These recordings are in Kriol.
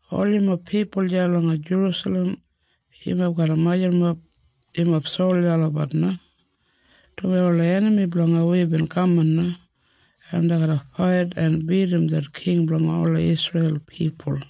“Ol yumob pipul deya langa Jerusalem, yumob garra majurrumap yumob solja olabat na, dumaji ola enami blanga wi bin kaman na, en dei garra fait en bidim det king blanga ola Isreil pipul.”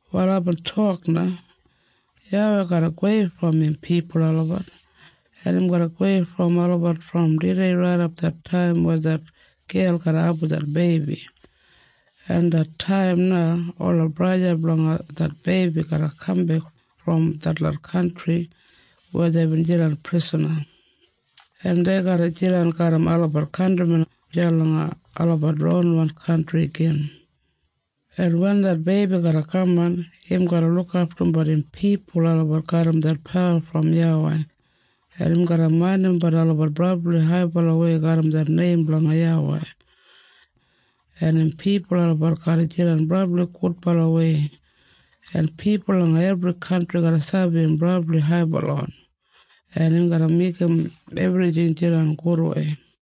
Wal aibin tok na, “YAWEI garra gowei brom im pipul olabat. Im garra gowei brom olabat brom tudei raidap det taim weya det gel garra abum det beibi, en det taim na ola braja blanga det beibi garra kambek brom detlot kantri weya deibin jidan prisana, en dei garra jidan garram olabat kantrimen deya langa olabat ronwan kantri igin. En wen det beibi garra kaman, im garra lukaftumbat im pipul olabat garram det pawa brom YAWEI, en im garra maindimbat olabat brabli haibalawei garram det neim blanga YAWEI, en im pipul olabat garra jidan brabli gudbalawei, en pipul langa ebri kantri garra sabi im brabli haibalawan, en im garra meigim ebrijing jidan gudwei.”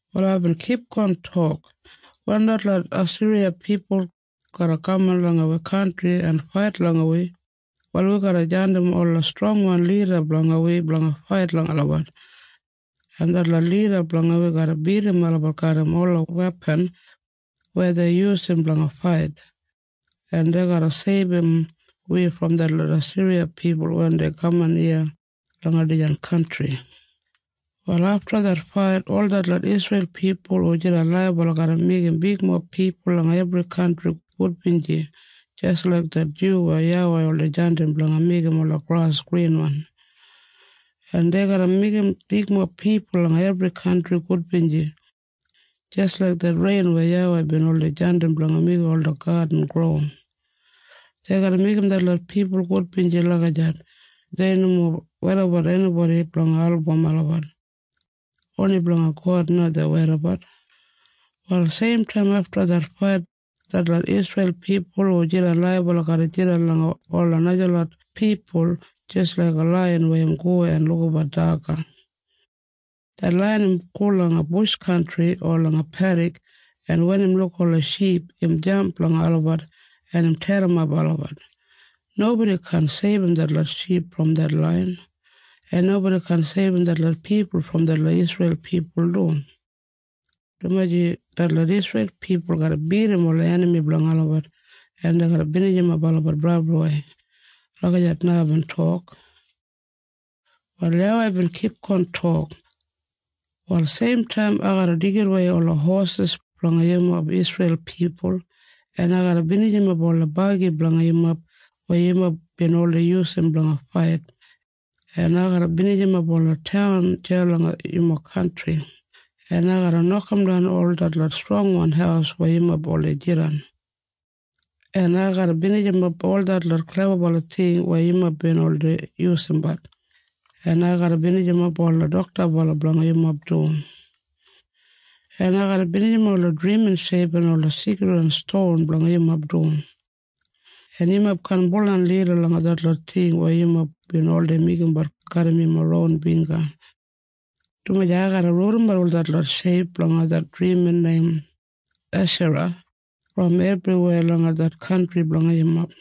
Wal aibin kipgon tok, “Wen detlot Asiriya pipul garra kaman langa wi kantri en fait langa wi, wal wi garra jandim ola strongwan lida blanga wi blanga fait langa olabat, en detlot lida blanga wi garra bidim olabat garram ola wepan weya dei yusum blanga fait, en dei garra seibum wi brom detlot Asiriya pipul wen dei kaman iya langa dijan kantri. “Wal afta det fait ol detlot Isreil pipul hu jidan laibala garra meigim bigmob pipul langa ebri kantri gudbinji jis laik det dyu weya YAWEI oldei jandim blanga meigim ola gras grinwan. En dei garra meigim bigmob pipul langa ebri kantri gudbinji jis laik det rein weya YAWEI oldei jandim blanga meigim ola gadin gro. Dei garra meigim detlot pipul gudbinji lagijat, dumaji dei nomo weidabat enibodi blanga album olabat. Oni blanga God na dei weidabat. “Wal seimtaim afta det fait detlot Isreil pipul hu jidan laibala garra jidan langa ola najalot pipul jis laiga laiyan weya im go en lukabat daga. Det laiyan im go langa bush kantri o langa pedik, en wen im luk ola ship, im jamp langa olabat, en im terrimap olabat. Nobodi kaan seibum detlot ship brom det laiyan. En nobodi kaan seibum detlot pipul brom detlot Isreil pipul du, dumaji detlot Isreil pipul garra bidim ola enami blanga olabat, en dei garra binijimap olabat brabliwei.” Lagijat na aibin tok. Wal YAWEI bin tok na, “Wal seimtaim ai garra deigidawei ola hosis blanga yumob Isreil pipul, en ai garra binijimap ola bagi blanga yumob weya yumob bin oldei yusum blanga fait, en ai garra binijimap ola taun deya langa yumob kantri, en ai garra nokamdan ol detlot strongwan haus weya yumob oldei jidan, en ai garra binijimap ol detlot klebabala ting weya yumob bin oldei yusumbat, en ai garra binijimap ola doktabala blanga yumob du. En ai garra binijimap ola drimin sheip en ola seikridwan ston blanga yumob du, en yumob kaan baudan lida langa detlot ting weya yumob bin oldei meigimbat garram yumob ron bingga, dumaji ai garra rudimat ol detlot sheip blanga det drimin neim Eshara brom ebriweya langa det kantri blanga yumob.